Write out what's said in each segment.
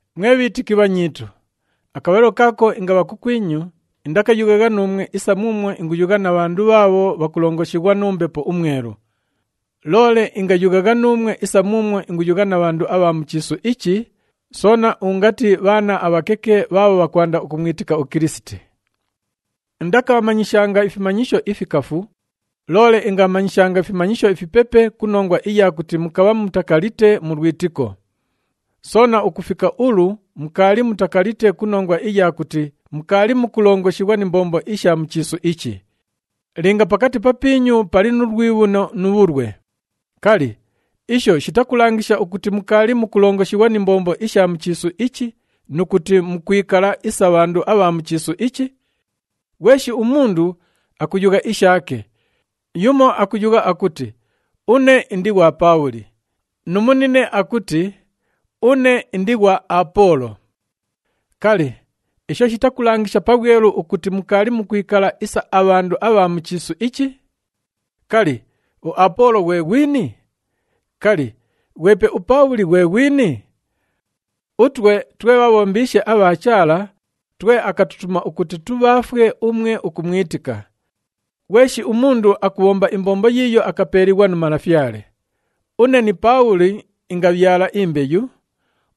Mwe bhiitiki bhanyiitu, akabhalilo kaako ingabha kukwinyu, indakayughagha nuumwe isa muumwo inguyugha na bhandu bhaabho bhakulongoshighwa nu Mbepo uMwelu. Loole ingayughagha nuumwe isa muumwo inguyugha na bhandu abha mu chiisu ichi, soona ungati bhaana abhakeke bhaabho bhakwanda ukumwitika uKilisiti. Indakabhamanyishanga ifimanyisho ifikafu, loole ingabhamanyishanga ifimanyisho ifipepe ku nongwa iya kuti mukabha mutakalite mu lwitiko. Soona ukufika ulu mukaali mutakalite ku nongwa iya kuti mukaali mukulongoshighwa ni mbombo isha mu chiisu ichi. Linga pakati papiinyu pali nu lwibhuno nu bhulwe, kali, isho shitakulangisha ukuti mukaali mukulongoshighwa ni mbombo isha mu chiisu ichi nu kuti mukwikala isa abhandu abha mu chiisu ichi? Ghweshi umundu akuyugha ishaake, yumo akuyugha akuti, “Une indi ghwa Paabhuli,” nu munine akuti, “Une indi ghwa Apoolo.” Kali, isho shitakulangisha pabhwelu ukuti mukaali mukwikala isa abhandu abha mu chiisu ichi? Kali, uApoolo ghwe ghwini? Kali, ghwepe uPaabhuli ghwe ghwini? Utwe twe bhabhombiishe abha Chaala twe akatutuma ukuti tubhaafwe umwe ukumwitika. Ghweshi umundu akubhomba imbombo yiiyo akapeeliighwa nu Malafyale. Une ni Paabhuli ingabhyala imbeyu,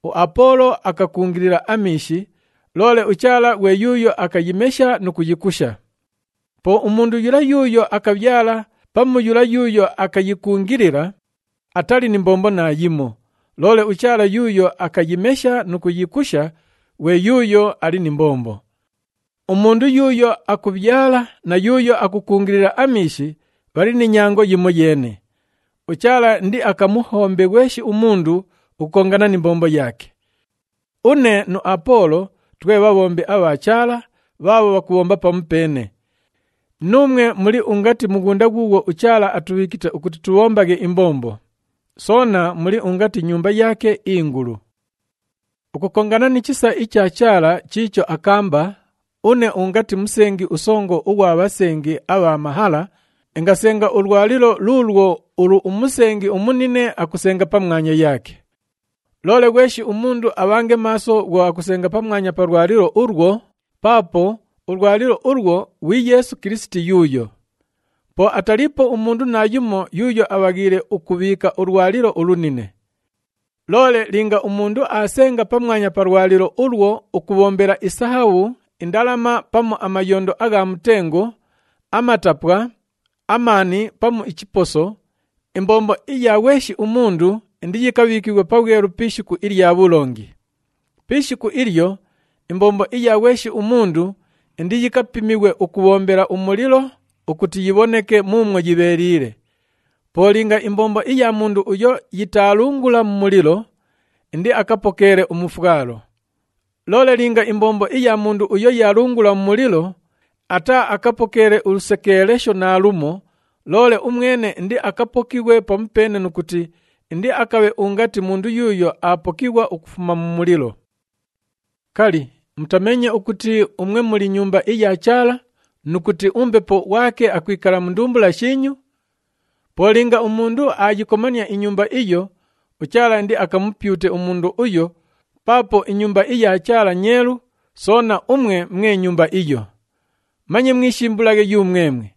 uApoolo akakungilila amiishi, loole uChaala ghwe yuuyo akayimesha nu kuyikusha. Po umundu yula yuuyo akabhyala pamu yula yuuyo akayikungilila, atali ni mbombo naayimo, loole uChaala yuuyo akayimesha nu kuyikusha ghwe yuuyo ali ni mbombo. Umundu yuuyo akubhyala na yuuyo akukungilila amiishi, bhali ni nyango yimoyeene. UChaala indiakamuhombe ghweshi umundu ukukongana ni mbombo yaake. Une nu Apoolo twe bhabhombi abha Chaala bhaabho bhakubhomba pamupeene. Nuumwe muli ungati mughunda ghuughwo uChaala atubhiikite ukuti tubhombaghe imbombo. Soona muli ungati nyumba yaake ingulu. Ukukongana ni chisa icha Chaala chiicho akaamba, une ungati musengi usongo ughwa bhasengi abha mahala, ingasenga ulwalilo luulwo ulu umusengi umunine akusenga pamwanya yaake. Loole ghweshi umundu abhange maaso bhwo akusenga pamwanya pa lwalilo ulwo, paapo ulwalilo ulwo ghwi Yeesu Kilisiti yuuyo. Po ataliipo umundu naayumo yuuyo abhaghiile ukubhiika ulwalilo ulunine. Loole linga umundu aasenga pamwanya pa lwalilo ulwo ukubhombela isahabhu, indalama pamu amayondo agha mutengo, amatapwa, amaani pamu ichiposo, imbombo iya ghweshi umundu indiyikabhiikighwe pabhwelu pi ishiku ilya bhulongi. Pi ishiku ilyo, imbombo iya ghweshi umundu indiyikapimighwe ukubhombela umulilo ukuti yibhoneke muumwo yibheeliile. Po linga imbombo iya mundu uyo yitaalungula mu mulilo, indiakapokeele umufwalo. Loole linga imbombo iya mundu uyo yaalungula mu mulilo, ataaakapokeele ulusekeelesho naalumo, loole umwene indiakapokighwe pamupeene nu kuti indiakabhe ungati mundu yuuyo aapokighwa ukufuma mu mulilo. Kali, mutameenye ukuti umwe muli Nyumba iya Chaala nu kuti uMbepo ghwake akwikala mu ndumbula shiinyu? Po linga umundu ayikomania iNyumba iyo, uChaala indiakamupyute umundu uyo paapo iNyumba iya Chaala nyeelu, soona umwe mwe Nyumba iyo. Manye mwishimbulaghe yumwemwe!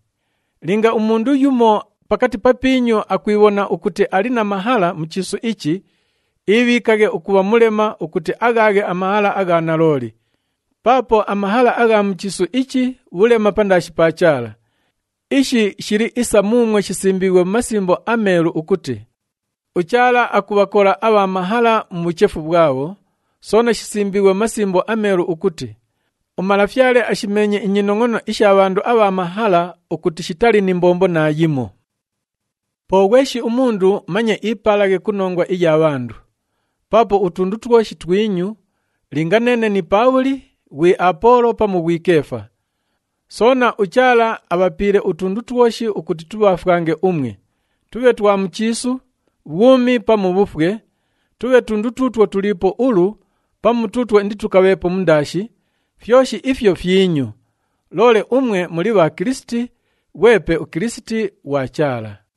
Linga umundu yumo pakati papiinyu akwibhona ukuti ali na mahala mu chiisu ichi, iibhiikaghe ukubha mulema ukuti aghaaghe amahala agha nalooli. Paapo amahala agha mu chiisu ichi, bhulema pandaashi pa Chaala. Ishi shili isa muumwo shisimbiighwe mu Masimbo aMeelu ukuti, “UChaala akubhakola abha mahala mu bhuchefu bhwabho.” Soona shisimbiighwe mu Masimbo aMeelu ukuti, “UMalafyale ashimeenye inyinongʼono isha bhandu abha mahala ukuti shitali ni mbombo naayimo.” Po ghweshi umundu manye iipaalaghe ku nongwa iya bhandu. Paapo utundu twoshi twinyu, linga neene ni Paabhuli, ghwi Apoolo pamu ghwi Keefa. Soona, uChaala abhapiile utundu twoshi ukuti tubhaafwange umwe, tubhe twa mu chiisu, bhwumi pamu bhufwe, tubhe tundu tuutwo tuliipo ulu pamu tuutwo inditukabheepo mundaashi, fyoshi ifyo fyinyu. Loole umwe muli bha Kilisiti, ghwepe uKilisiti ghwa Chaala.